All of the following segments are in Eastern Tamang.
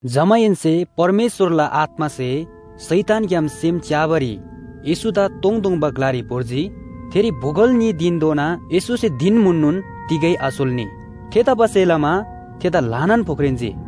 जमाहेन्‍से परमेश्‍वरला आत्‍मासे शैतानग्‍याम सेम च्‍याबारी येशूदा तोङतोङबा ग्‍लारी भोर्जी। थेरी बोगल न्‍ही धिनधोना येशूसे धिन म्‍हुननोन तिगै आसोल्‍नी। थेतबासेलमा थेदा ल्‍हानान फोख्रेन्‍जी।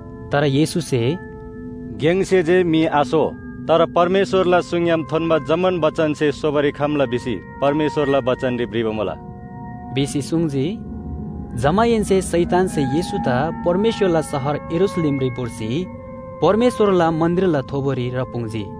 तर येशूसे “गेङसे जे म्‍हि आसो, तर परमेश्‍वरला सुङग्‍याम थोन्‍बा जम्‍मान बचनसे सोबारी खम्‍ला भिसी परमेश्‍वरला बचनरी भ्रिबा मुला” भिसी सुङ्जी। जमाहेन्‍से शैतानसे येशूदा परमेश्‍वरला शहर यरूशलेमरी भोर्सी परमेश्‍वरला मन्‍दिरला थोबोरी राप्‍पुङ्जी।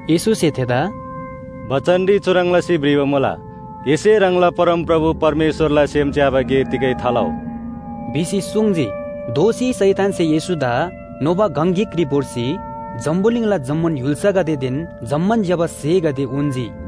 येशूसे थेदा “बचनरी चुह्रङ् लसी भ्रिबा मुला, ‘एसे ह्राङला परमप्रभु परमेश्‍वरला सेम च्‍याबा गे तिगै थालउ’” भिसी सुङ्जी। दोःसी शैतानसे येशूदा नोबा गङ गिकरी भोर्सी जम्‍बुलिङला जम्‍मान य्‍हुल्‍सागदेदेन जम्‍मान ज्‍यबा स्‍हेगदे उन्‍जी।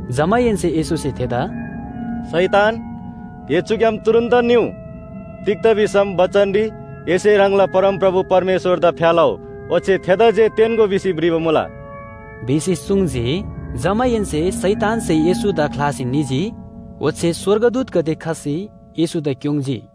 जमाहेन्‍से येशूसे थेदा “शैतान, ए चुग्‍याम तुरुन्‍तन निउ! तिग्‍दा भिसम बचनरी ‘एसे ह्राङला परमप्रभु परमेश्‍वरदा फ्‍या लउ, ओच्‍छे थेदा जे तेन्‍गो’ भिसी भ्रिबा मुला” भिसी सुङ्जी। जमाहेन्‍से शैतानसे येशूदा ख्‍लासी निजी ओच्‍छे स्‍वर्गदूतगदे खसी येशूदा क्‍योङ्‌जी।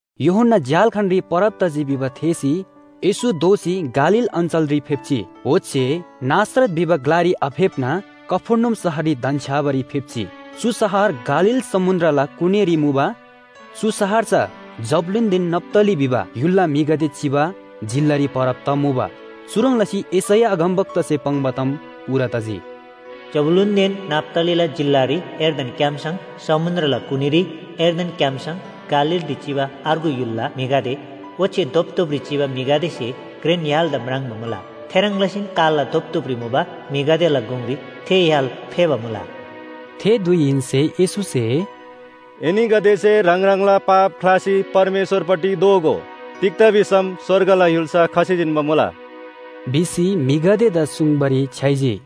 यूहन्‍ना झ्‍याल्‍खानरी परब तजी भिबा थेःसी येशू दोःसी गालील अञ्‍चलरी फेप्‍जी। ओच्‍छे नासरत भिबा ग्‍लारी आफेप्‍ना कफर्नहुम शहररी धन्‍छ्‌याबारी फेप्‍जी। चु शहर गालील समुन्‍द्रला कुनीरी मुबा, चु शहर चा जबूलूनदेन नप्‍ताली भिबा य्‍हुलला म्‍हिगदे चिबा जिल्‍लारी परब तमुबा। चुह्रङ् लसी यशैया अगमवक्तासे पाङ्बा ताम पूरा तजी, “जबूलूनदेन नप्‍तालीला जिल्‍लारी यर्दन क्‍याम्‍सङ, समुन्‍द्रला कुनीरी, यर्दन क्‍याम्‍सङ, गालीलरी चिबा अर्गु य्‍हुलला म्‍हिगदे ओच्‍छे धोपधोपरी चिबा म्‍हिगदेसे घ्रेन य्‍हालदा म्राङ्बा मुला। थेह्रङ् लसीन कालला धोपधोपरी मुबा म्‍हिगदेला गुङरी थे य्‍हाल फेःबा मुला।” थे धुइहेन्‍से येशूसे “एनीगदेसे ह्राङ ह्राङला पाप ख्‍लासी परमेश्‍वरपट्टि दोःगो, तिग्‍दा भिसम स्‍वर्गला य्‍हुल्‍सा खसी जिन्‍बा मुला” भिसी म्‍हिगदेदा सुङ्बारी छ्‌याइजी।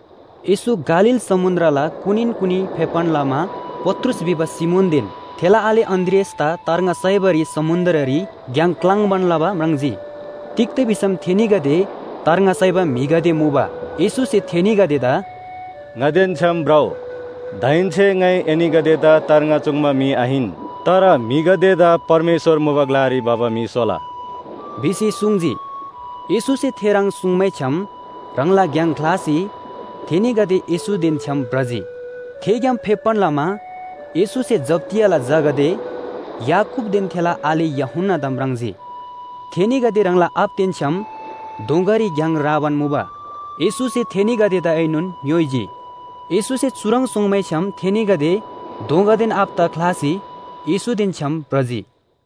येशू गालील समुन्‍द्रला कुनीन कुनी फेप्‍बान लमा पत्रुस भिबा सिमोनदेन थेला आले अन्‍द्रियासदा तार्ङा साइबारी समुन्‍द्ररी घ्‍याङ क्‍लाङ्बान लबा म्राङ्जी। तिग्‍दा भिसम थेनीगदे तार्ङा साइबा म्‍हिगदे मुबा। येशूसे थेनीगदेदा “ङादेन छ्‌याम भ्रउ, दाहेन्‍से ङाइ एनीगदेदा तार्ङा चुङ्बा म्‍हि आहिन, तर म्‍हिगदेदा परमेश्‍वर मुबा ग्‍लारी भबा म्‍हि स्‍होला” भिसी सुङ्जी। येशूसे थेह्रङ् सुङ्मैछ्‌याम, ह्राङला घ्‍याङ ख्‍लासी थेनीगदे येशूदेन छ्‌याम भ्रजी। थेग्‍याम फेप्‍बान लमा येशूसे जब्‍दियाला झागदे याकूबदेन थेला आले यूहन्‍नादा म्राङ्जी। थेनीगदे ह्राङला आबादेन छ्‌याम दोँगारी घ्‍याङ राबान मुबा। येशूसे थेनीगदेदाएनोन ङ्‌योइजी। येशूसे चुह्रङ् सुङ्मैछ्‌याम थेनीगदे दोँगादेन आबादा ख्‍लासी येशूदेन छ्‌याम भ्रजी।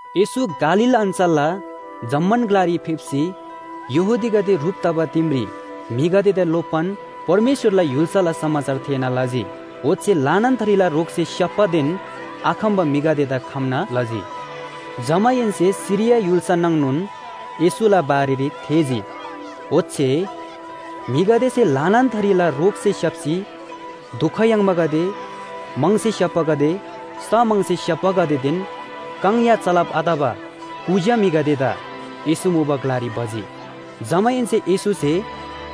येशू गालील अञ्‍चलला जम्‍मान ग्‍लारी फेप्‍सी यहूदीगदे ह्रुप तबा दिमरी म्‍हिगदेदा लोप्‍बान परमेश्‍वरला य्‍हुल्‍साला समाचार थेःना लजी। ओच्‍छे ल्‍हानान थरीला रोगसे स्‍याप्‍बादेन आखम्‍बा म्‍हिगदेदा खम्‍ना लजी। जमाहेन्‍से सिरिया य्‍हुल्‍सा नाङनोन येशूला बारेरी थेःजी। ओच्‍छे म्‍हिगदेसे ल्‍हानान थरीला रोगसे स्‍याप्‍सी दुख याङ्बागदे, म्‍हङसे स्‍याप्‍बागदे, स्‍ह म्‍हङसे स्‍याप्‍बागदेदेन काङ या चलब आतबा कुज्‍या म्‍हिगदेदा येशू मुबा ग्‍लारी भजी। जमाहेन्‍से येशूसे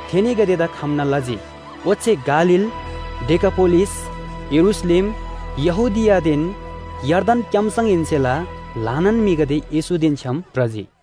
थेनीगदेदा खम्‍ना लजी। ओच्‍छे गालील, डेकापोलिस, यरूशलेम, यहूदियादेन यर्दन क्‍याम्‍सङहेन्‍सेला ल्‍हानान म्‍हिगदे येशूदेन छ्‌याम भ्रजी।